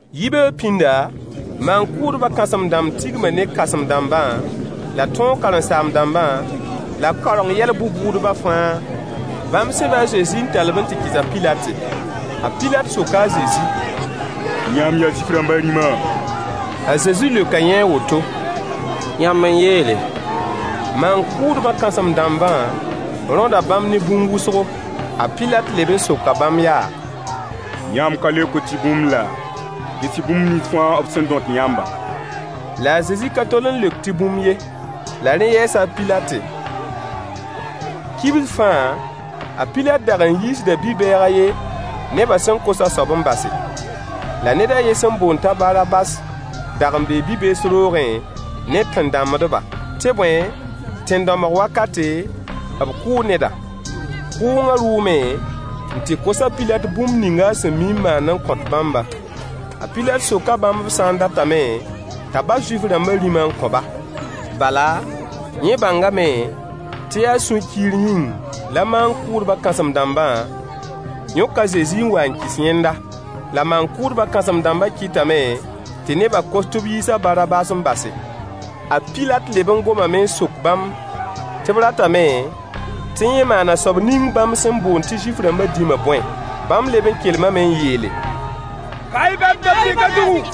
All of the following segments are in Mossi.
Yibeoog pĩnda, maan-kʋʋdbã kãsem-dãmb tigma ne kãsem-dãmbã la tõog karen-saam-dãmbã, la kaoreng yɛl bʋ-bʋʋdbã fãa. Bãmb sẽba a Zezi n tall-b n tɩ kɩs a Pilat. A Pilat soka a Zezi: Yãmb yaa Zuif-rãmbã rĩma? A Zezi leoka yẽ a woto: Yãmb n yeele. Maan-kʋʋdbã kãsem-dãmbã rõda bãmb ne bũmb wʋsgo. A Pilat leb n soka bãmb yaa: Yãmb ka leokd tɩ bũmb laa? Ges-y bũmb nins fãa b sẽn dõt yãmbã. La a Zezi ka tol n leok tɩ bũmb ye. La rẽ yɛɛsa a Pilat. Kibs fãa, a Pilat dag n yiisda bi-bɛɛg a yen, nebã sẽn kos a soabã n base. La ned a yen sẽn boond t'a Barabas dag n bee bi-bees roogẽ ne tẽn-dãmbdba, tɩ bõe, tẽn-dãmbg wakate, b kʋʋ neda. Kʋʋngã rʋʋme n tɩ kos a Pilat bũmb ning a sẽn mi n maand n kõt bãmbã. A Pilat soka bãmb b sã n datame t'a bas Zuif-rãmbã dĩmã n kõ-ba. Bala, yẽ bãngame tɩ yaa sũ-kiir yĩng la maan-kʋʋdbã kãsem-dãmbã yõk a Zezi n wa n kɩs yẽnda. La maan-kʋʋdbã kãsem-dãmbã kɩtame tɩ nebã kos tɩ b yiis a Barabas n base. A Pilat leb n gomame n sok bãmb tɩ b ratame tɩ yẽ maan a soab ning bãmb sẽn boond tɩ Zuif-rãmbã dĩmã bõe? Bãmb leb n kelmame n yeele: Ka-y bãmb da-pɩk zugu.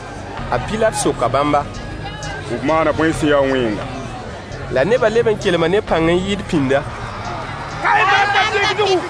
A Pilat soka bãmba: B maana bõe sẽn ya wẽnga? La nebã leb n kelma ne pãng n yɩɩd pĩnda: Ka-y bãmb da-pɩk zugu.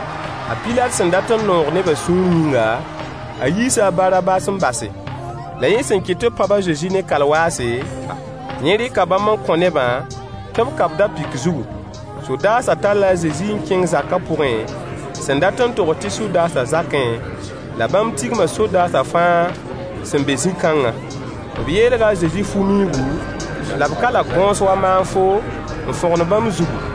A Pilat sẽn dat n noog neba sũur yĩnga, a yiisa a Barabas n base. La yẽ sẽn kɩt tɩ b pãb a Zezi ne kalwaase, yẽ rɩka bãmb n kõ nebã tɩ b ka-b da-pɩk zugu. Sodaasã talla a Zezi n kẽng zaka pʋgẽ, sẽn dat n togs tɩ sodaasã zakẽ, la bãmb tigma sodaasã fãa sẽn be zĩ-kãngã. B yeelga a Zezi fu-miuugu, la b kala gõos wa maanfo n fõgen bãmb zugu.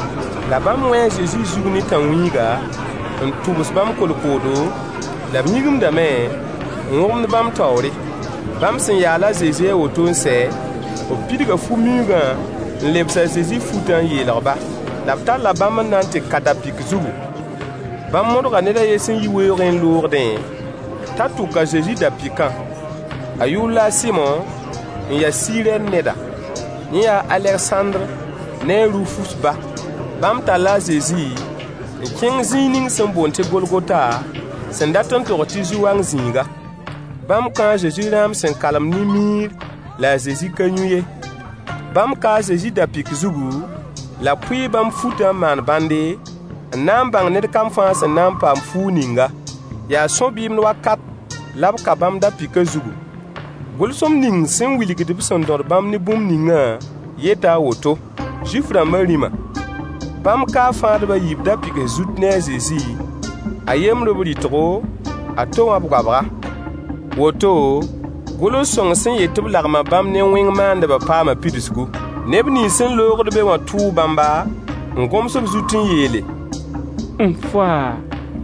La bãmb wẽe a Zezi zug ne tãnwĩiga, n tʋbs bãmb kolkoodo, la b yĩgimdame n wõgemd bãmb taoore. Bãmb sẽn yaal a Zezi a woto n sɛ, b pidga fu-miuugã n lebs a Zezi futã n yeelg-ba, la b talla bãmb n na n tɩ ka da-pɩk zugu. Bãmb modga ned a yen sẽn yi weoogẽ n loogdẽ t'a tʋk a Zezi da-pɩkã. A yʋʋr la a Sɩmo, n ya Sirɛn neda. Yẽ yaa a Alegsãndr ne a Rufus ba. Bãmb talla a Zezi n kẽng zĩig ning sẽn boond tɩ Golgota, sẽn dat n togs tɩ zu-wang zĩiga. Bãmb kõo a Zezi rãam sẽn kalem ne miir la a Zezi ka yũ ye. Bãmb kaa a Zezi da-pɩk zugu, la b pʋɩɩ bãmb futã n maan bãnde, n na n bãng ned kam fãa sẽn na n paam fuug ninga. Yaa sõ-bɩɩmd wakat la b ka bãmb da-pɩkã zugu. Gʋlsem ning sẽn wilgd b sẽn dõd bãmb ne bũmb ningã yeta a woto: Zuif-rãmbã rĩma. Bãmb kaa fãadb a yiib da-pɩgs zut ne a Zezi: A yembr b rɩtgo, a to wã b goabga. [ Woto, gʋls-sõng sẽn yet tɩ b lagma bãmb ne wẽng maandbã paama pidsgu.] Neb nins sẽn loogd be wã tʋʋ bãmba, n gõms b zut n yeele: N-faa!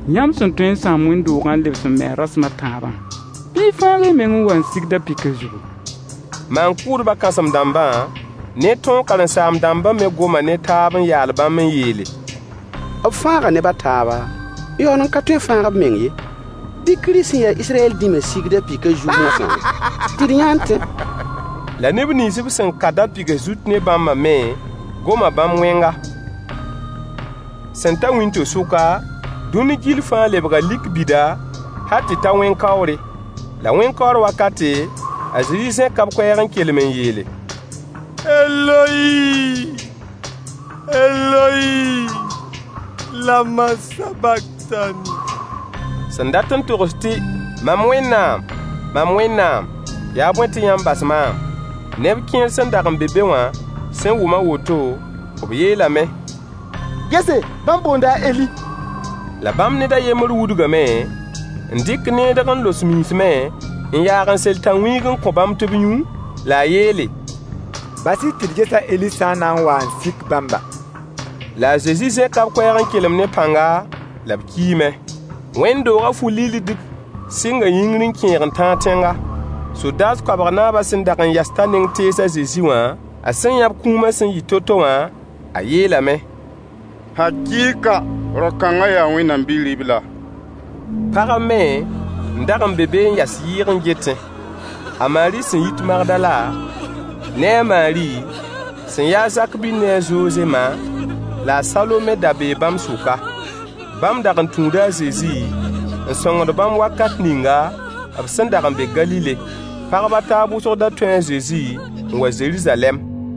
Yãmb sẽn tõe n sãam wẽnd-doogã n lebs n me-a rasem a tãabã, bɩ y fãag y meng n wa n sig da-pɩkã zugu. Maan-kʋʋdbã kãsem-dãmbã ne tõog karen-saam-dãmbã me goma ne taab n yaal bãmb n yeele: B fãaga neb a taaba, n yaool n ka tõe n fãag b meng ye. Bɩ Kirist sẽn ya Israyɛl dĩmã sig da-pɩkã zug moasã tɩ d yã n tẽ. La neb nins b sẽn ka da-pɩgs zut ne bãmbã me goma bãmb wẽnga. Sẽn ta wĩnto-sʋka, dũni gill fãa lebga lik bida hal tɩ ta wẽn-kaoore. La wẽn-kaoor wakate, a Zezi zẽka b koɛɛg n kelem n yeele: Eloyi! Eloyi! Lama sabaktani? Sẽn dat n togs tɩ: “Mam Wẽnnaam! Mam Wẽnnaam! Yaa bõe tɩ yãmb bas maam?” Neb kẽer sẽn dag n be be wã sẽn wʋm a woto, b yeelame: Gese, bãmb boonda a Eli. La bãmb ned a yembr wudgame n dɩk needg n los miismẽ, n yaag n sel tãnwĩig n kõ bãmb tɩ b yũ, la a yeele: Bas-y tɩ d ges a Eli sã n na wa n sik bãmba. La a Zezi zẽka b koɛɛg n kelem ne pãnga, la b kiime. Wẽnd-doogã fu-lilldig sɩnga yĩngr n kẽeg n tãag tẽnga. Sodaas koabg naabã sẽn dag n yas t'a neng tees a Zezi wã, a sẽn yã b kũuma sẽn yɩ to-to wã, a yeelame: Hakɩɩka, rao-kãngã yaa Wẽnnaam Bi-ribla. Pagb me n dag n be be n yas yɩɩg n getẽ. A Maari sẽn yit Magdala, ne a Maari sẽn ya a Zak-bil ne a Zoze ma, la a Salome da bee bãmb sʋka. Bãmb dag n tũuda a Zezi n sõngd bãmb wakat ninga b sẽn dag n be Galile. Pagb a taab wʋsg da tũu a Zezi n wa Zeruzalɛm.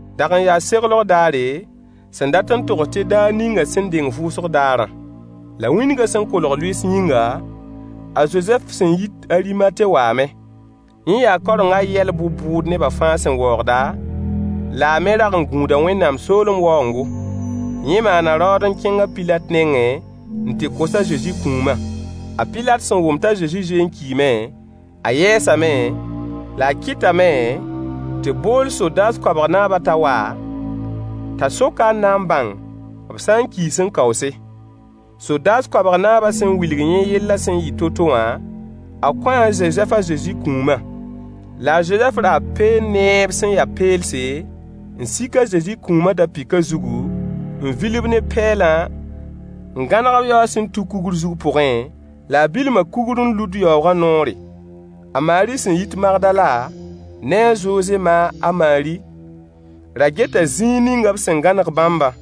Dag n yaa seglg daare, sẽn dat n togs tɩ daar ninga sẽn deng vʋʋsg daarã. La wĩndgã sẽn kolg lʋɩɩs yĩnga, a Zozɛf sẽn yit Arimate waame. Yẽ yaa kaorengã yɛl bʋ-bʋʋd neba fãa sẽn waoogda, la a me rag n gũuda Wẽnnaam soolem waoongo. Yẽ maana raood n kẽng a Pilat nengẽ n tɩ kos a Zezi kũumã. A Pilat sẽn wʋm t'a Zezi zoe n kiime, a yɛɛsame, la a kɩtame tɩ b bool sodaas koabg naabã t'a wa, t'a sok-a n na n bãng b sã n kii sẽn kaoose. Sodaas koabg naabã sẽn wilg yẽ yellã sẽn yɩ to-to wã, a kõo a Zozɛf a Zezi kũumã. La a Zozɛf raa lẽ peen-peelse, n sik a Zezi kũumã da-pɩkã zugu, n vil-b ne pɛɛlã n gãneg-b yaoog sẽn tuk kugr zug pʋgẽ, la a bilma kugr n lud yaoogã noore. A Maari sẽn yit Magdala ne a Zoze ma a Maari ra geta zĩig ninga b sẽn gãneg bãmbã.